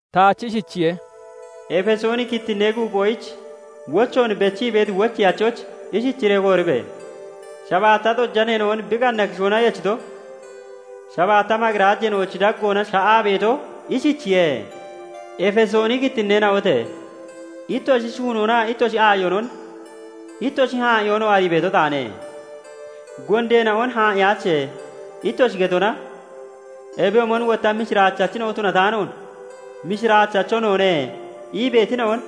Taach ishichiye:- "Efesooni kittinnee guuphoyich wochoon bechii beeti wocheyachoyich ishichiree kooribe! Shabaatta xojaneena'on bi qanna kishoona yechito, shabaatta maqirajeena'ochi daggoona sha'aa beeto ishichiye:- Efesooni kittinneena'ote! Ittoshi shuunoonaa ittoshi aayonon, ittoshi haa'iyoonoo arii beeto taane; gondeena'on 'Haa'iyaache' ittoshi getonaa ebiyoomon wotta mishiraachachina'o tunataanoon 'Mishiraachacho noone' ii beetina'on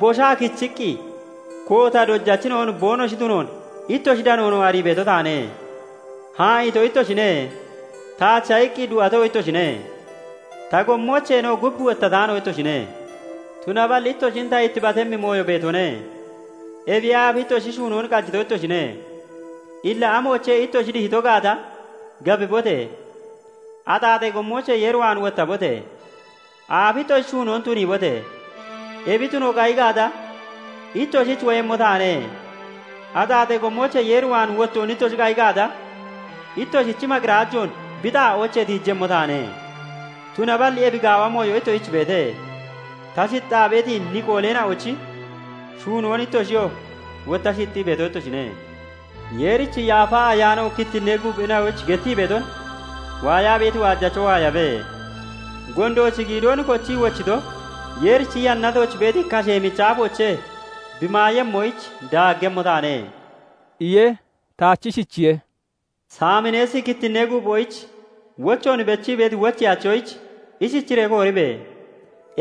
boshaa kichiqqi koota dojachina'o boonoshi tunoon ittoshi danoonon arii beeto taane. Haa'iito ittoshine; taacha iqqi du'ato ittoshine; ta gommoocheenoo gub wottataano ittoshine; tunaballi ittoshin ta ittibatemmi mooyo beetone; ebiyee aafi ittoshi shunoon qajito ittoshine. Illa amoochee ittoshi dihito gaata gabibote! Axaaxee gommoochee Yeer waan wottabote! Aafi ittoshi shuunoon tuniibote! Ebi tuno qayi gaata, ittoshich woyemmo taane; axaaxee gommoochee Yeer waan wottoon ittoshi qayi gaata, ittoshichi maqirajoon bi xaa'oochee tiijemmo taane. Tunaballi ebi gaawa mooyo ittoshich beete; ta shixxaa beeti Niqooleena'ochi shuunoon ittoshiyoo wotta shixxii beeto ittoshine. Yeerichi Yaafa Ayaano kittinnee guuphina'oyich gettii beeton waayaa beeti waajacho waayabe. Gondoochi giidoon kochii wochito Yeerichi yannatooch beeti kashee michi aafoochee bi maayemmoyich daaggemmo taane" iye. Taach ishichiye:- "Saamineesi kittinnee guuphoyich wochoon bechii beeti wocheyachoyich ishichiree kooribe!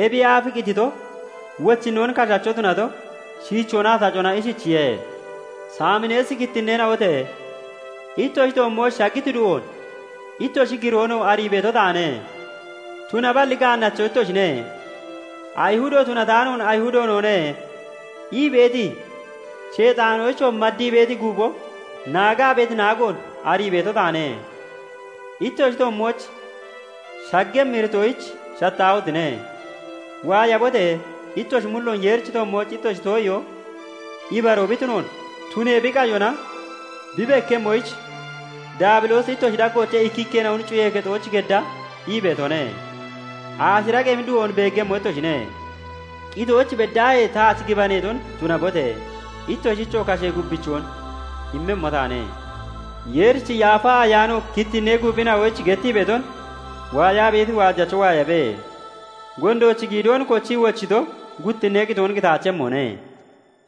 Ebiyee aaf qitito, wochinnoon kashacho tunato, Shiichoonaa Tacona ishichiye:- Saamineesi kittinneena'ote! Ittoshi toommooch shaggiti du'oon, ittoshi giroonoo arii beeto taane; tunaballi gaannacho ittoshine; Ayihudo tunataanoon 'Ayihudo noone' ii beeti, Sheexaanoyichoo maddii beeti guupho naagaa beeti naagoon arii beeto taane. Ittoshi toommooch shaggemmi iritoyich shattaahotine! Waayabote! Ittoshi mulloon Yeerichi toommooch ittoshi too'iyoo ibaroo bi tunoonaa tunee bi qayona bi bekkemmoyich, Daabiloosi ittoshi daggoochee ikkikkeena'on cuyee kexooch gedda ii beetone; aashira qemi du'oon beeggemmo ittoshine. Qitooch beddaahee taach gibaneeton tunabote! Ittoshichoo kashee gubbichoon immemmo taane. Yeerichi Yaafa Ayaano kittinnee guuphina'oyich gettii beeton waayaa beeti waajacho waayabe. Gondoochi giidoon kochii wochito guttinnee qitoon qitaachemmone"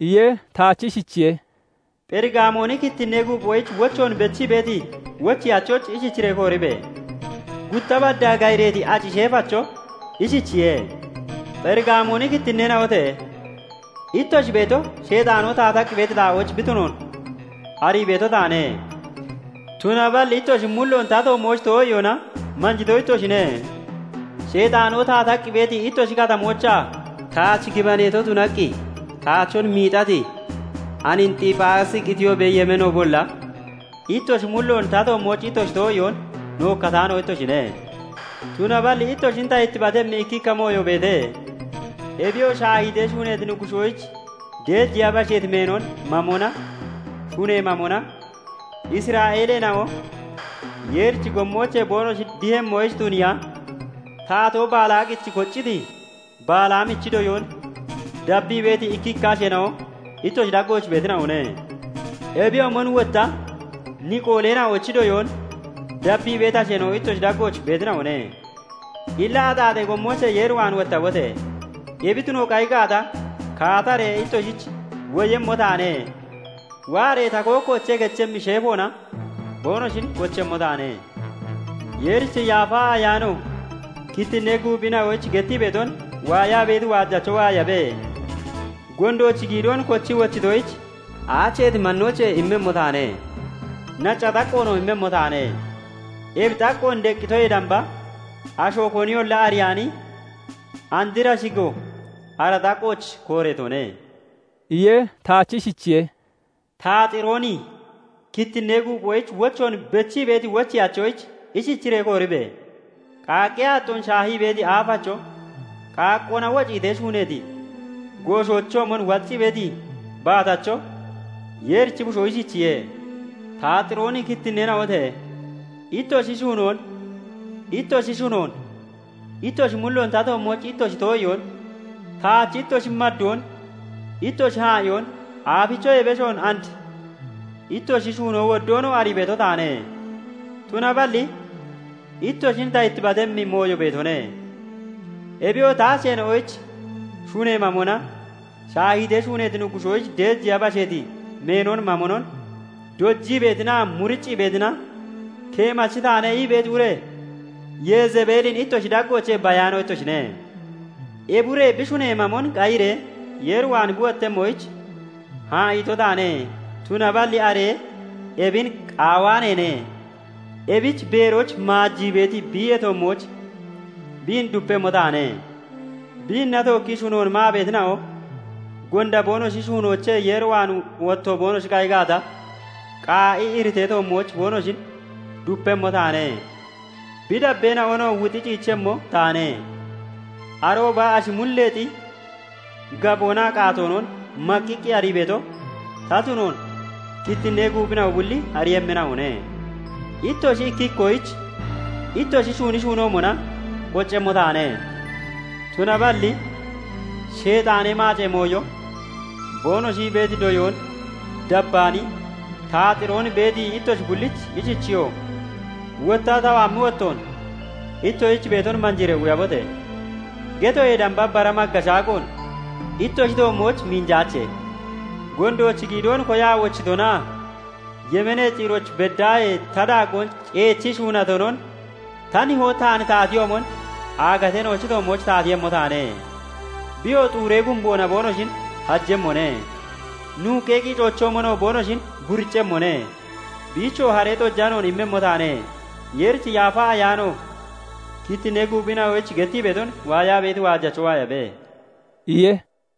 iye. Taach ishichiye:- "Pherigaamooni kittinnee guuphoyich wochoon bechii beeti wocheyachoyich ishichiree kooribe! Gutta baddaa gayireeti aci sheefacho ishichiye:- Pherigaamooni kittinneena'ote! Ittoshi beeto Sheexaanoo taataqqi beeti xaa'ooch bi tunoon arii beeto taane; tunaballi ittoshi mulloon ta toommooch too'iyoona manjito ittoshine; Sheexaanoo taataqqi beeti ittoshi katamoochaa taach gibaneeto tunaqqi taachon miixati Anxiphaasi qitiyoobee yemeenoobolla, ittoshi mulloon ta toommooch ittoshi too'iyoon nookkataano ittoshine. Tunaballi ittoshin ta ittibatemmi ikkikka mooyo beete; ebiyoo shaahiitee shuuneeti nuggushoyich deejeya basheeti meenon mamonaa shunee mamona Isra'eeleena'o Yeerichi gommoochee boonoshi dihemmoyich tuniiya, Taatoo Balaaqich kocciti Balaamichi doyoon dabbii beeti ikkikka asheena'o ittoshi daggooch beetina'one. Ebiyoomon wotta Niqooleena'ochi doyoon dabbii beeti asheena'o ittoshi daggooch beetina'one. Illa axaaxee gommoochee Yeer waan wottabote! Ebi tuno qayi gaata, kaataree ittoshich woyemmo taane; waaree ta kookkoochee kechemmi sheefoona boonoshin kochemmo taane. Yeerichi Yaafa Ayaano kittinnee guuphina'oyich gettii beeton waayaa beeti waajacho waayabe. Gondoochi giidoon kochii wochitoyich aacheeti mannoochee immemmo taane; nacca xaqqoonoo immemmo taane; ebi xaqqoon deqqitoyee damba asho koniyolla ariyaani andra shigo ara xaqqooch kooreetone" iye. Taach ishichiye:- "Taaxirooni kittinnee guuphoyich wochoon bechii beeti wocheyachoyich ishichiree kooribe! Qaaqqee aaxxoon shaahii beeti aafacho, qaaqqoona wociitee shuuneeti gooshoochoomon waccii beeti baatacho, Yeerichi Bushoo ishichiye:- Taaxirooni kittinneena'ote! Ittoshi shuunoon, ittoshi shunoon, ittoshi mulloon ta toommooch ittoshi too'iyoon, taach ittoshi maddoon, ittoshi haa'iyoon, aafichoyee beshoon andi ittoshi shuunoo woddoonoo arii beeto taane. Tunaballi ittoshin ta ittibatemmi mooyo beetone; ebiyoo ta asheena'oyich shunee mamonaa shaahiitee shuuneeti nuggushoyich deejeya basheeti meenon mamonon dojii beetinaa muriccii beetina, 'Keemachi taane' ii beeti ure Yezebeelin ittoshi daggoochee bayaano ittoshine. Ebi ure bi shunee mamon qayiree Yeer waan bi wottemmoyich haa'iito taane; tunaballi are ebin qaawaaneene. Ebich beerooch maajii (maayii) beeti biiyee toommooch biin dupemmo taane; biinna tookkii shunoon maa beetina'oo gonda boonoshi shuunoochee Yeer waan wotto boonoshi qayi gaata, qaa'i iritee toommooch boonoshin dupemmo taane. Bi dabbeena'onoo wuxi ciichemmo taane. Arooba ashi mulleexi gaboonaa qaatoonon maqqiqqa arii beeto ta tunoon kittinnee guuphina'o bulli ariiyemmina'one; ittoshi ikki ikkoyich ittoshi shuuni shuunoomona qoccemmo taane. Tunaballi 'Sheexaanee maacee mooyo' boonoshi ii beeti doyoon dabbaani, Taaxiroon beeti ittoshi bullich ishichiyo:- 'Wottaa ta waammi wottoon ittoshich beeton manjiiree quyabote!' getoyee damba bara magga shaagoon ittoshi toommooch minjaache. Gondoochi giidoon koyaa wochitonaa yemeenee ciirooch beddaahee ta daaggoon ceechii shuunatonon, ta Nihoo taan taatiyoomon aagateena'ochi toommooch taatiiyemmo taane; biyoo xuuree gumboona boonoshin hajemmone; nuuqqee qiicoochoomon boonoshin buriccemmone; biichoo haree xojanoon immemmo taane. Yeerichi Yaafa Ayaano kittinnee guuphina'oyich gettii beeton waayaa beeti waajacho waayabe" iye.